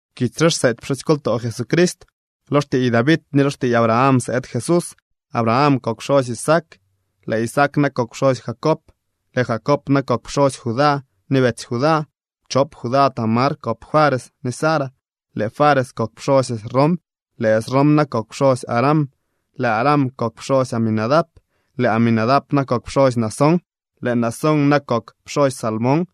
Kitsy re xseety pxusykoltoo Jesucrist. Lo xtiiy David ni lo xtiiy Abraham sëëd Jesús. Abraham kok pxosy Isaac, lëë Isaac na kok pxosy Jacob, lëë Jacob na kok pxosy Judá ni betsy Judá. Chop Judá Tamar kop Fares ni Zara. Lëë Fares kok pxosy Esrom, lëë Esrom na kok pxosy Aram. Lëë Aram kok pxosy Aminadab, lëë Aminadab na kok pxosy Naasón, lëë Naasón na kok pxosy Salmón.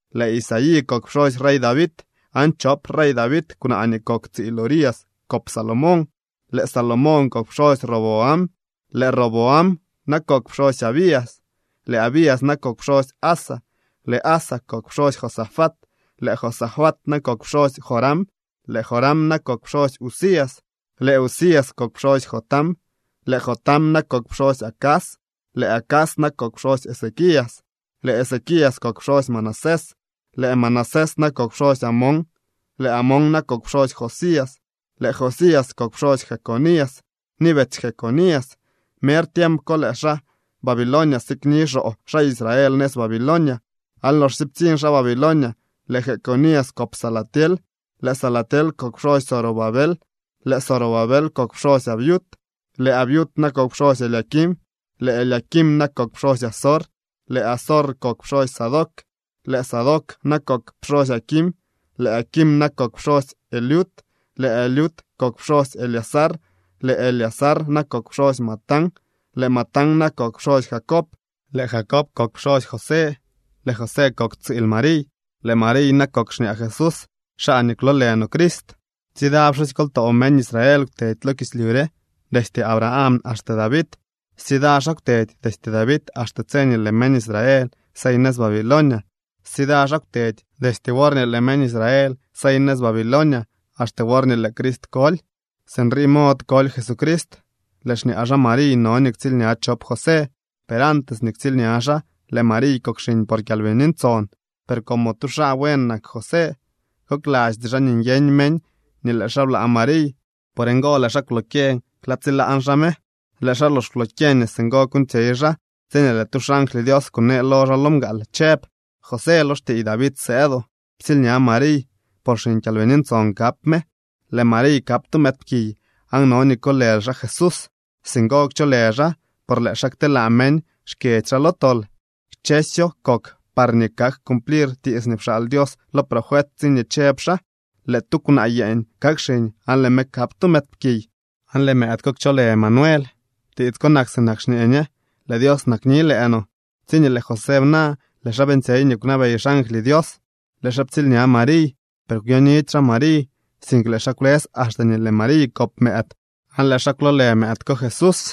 Lëë Isaí kok pxosy rey David aan chop rey David kwnaa nii kok tsiil Urías kop Salomón. Lëë Salomón kok pxosy Roboam, lëë Roboam na kok pxosy Abías, lëë Abías na kok pxosy Asa. Lëë Asa kok pxosy Josafat, lëë Josafat na kok pxosy Joram, lëë Joram na kok pxosy Uzías. Lëë Uzías kok pxosy Jotam, lëë Jotam na kok pxosy Acaz, lëë Acaz na kok pxosy Ezequías. Lëë Ezequías kok pxosy Manasés, lëë Manasés na kok pxosy Amón, lëë Amón na kok pxosy Josías. Lëë Josías kok pxosy Jeconías ni betsy Jeconías. Mer tiemp ko lëë xaa Babilonia sikni xoo xaa Israel nëz Babilonia. Aan loxsye ptsiñ xaa Babilonia, lëë Jeconías kop Salatiel. Lëë Salatiel kok pxosy Zorobabel. Lëë Zorobabel kok pxosy Abiud, lëë Abiud na kok pxosy Eliaquim, lëë Eliaquim na kok pxosy Azor. Lëë Azor kok pxosy Sadoc, lëë Sadoc na kok pxosy Aquim, lëë Aquim na kok pxosy Eliud. Lëë Eliud kok pxosy Eleazar, lëë Eleazar na kok pxosy Matán, lëë Matán na kok pxosy Jacob. Lëë Jacob kok pxosy José, lëë José kok tsiil Mariy, lëë Mariy na kok xñaa Jesús, xaa nii kwloolë no Crist. Tsida pxusykoltoo meñ Israel kwtedy lo kislyu re destye Abraham axte David. Stsida xaa kwtedy destye David axte tse nii lëë meñ Israel sey nëz Babilonia. Stsida xaa kwtedy destye worñee lëë meñ Israel sey nëz Babilonia axte worñee lëë Crist koly. Sinrii mod koly Jesucrist. Lëë xñaa xaa Mariy no nii ktsiilña chop José. Per antes nii ktsiilña xaa, lëë Mariy kok xiñ por Kyalbini Ntson. Per como tu xaa buen nak José, koklasty xaa nii nyeñ meñ nii lëë xaa blaa Mariy. Por ngo lëë xaa kwlokyeñ klaa tsilaan xaa me. Lëë xaa lox kwlokyeñ nii singo kuuñtsyey xaa, tsiñee lëë tu xangly Dios kunee lo xaa lo mgaal chëb: —José, lo xtiiy David sëëdoo. Ptsiilña Mariy, por xiñ Kyalbini Ntson kap me. Lëë Mariy kap tu mëëdpkiy aan no nii kolël xaa Jesús. Singo kcholë xaa por lëë xaa kteelaa meñ xkyedzy xaa lo tol. Kchësyo kok parñee kak cumplir tiits nii pxaal Dios lo profet tsiñee chëb xaa: Lëë tu kwnaa yeeñ kakxiñ aan lëë me kap tu mëëdpkiy, aan lëë mëëd ko kcholë Emanuel. (Tiits ko nak sinak xñee ñe: Lëë Dios nakni lëë no.) Tsiñee lëë José bna, lëë xaa beeñtsyey nii kwnabey xangly Dios. Lëë xaa ptsiilña Mariy. Per kwyonidy xaa Mariy, sink lëë xaa kwlës axte nii lëë Mariy kop mëëd. Aan lëë xaa kwloolë mëëd ko Jesús.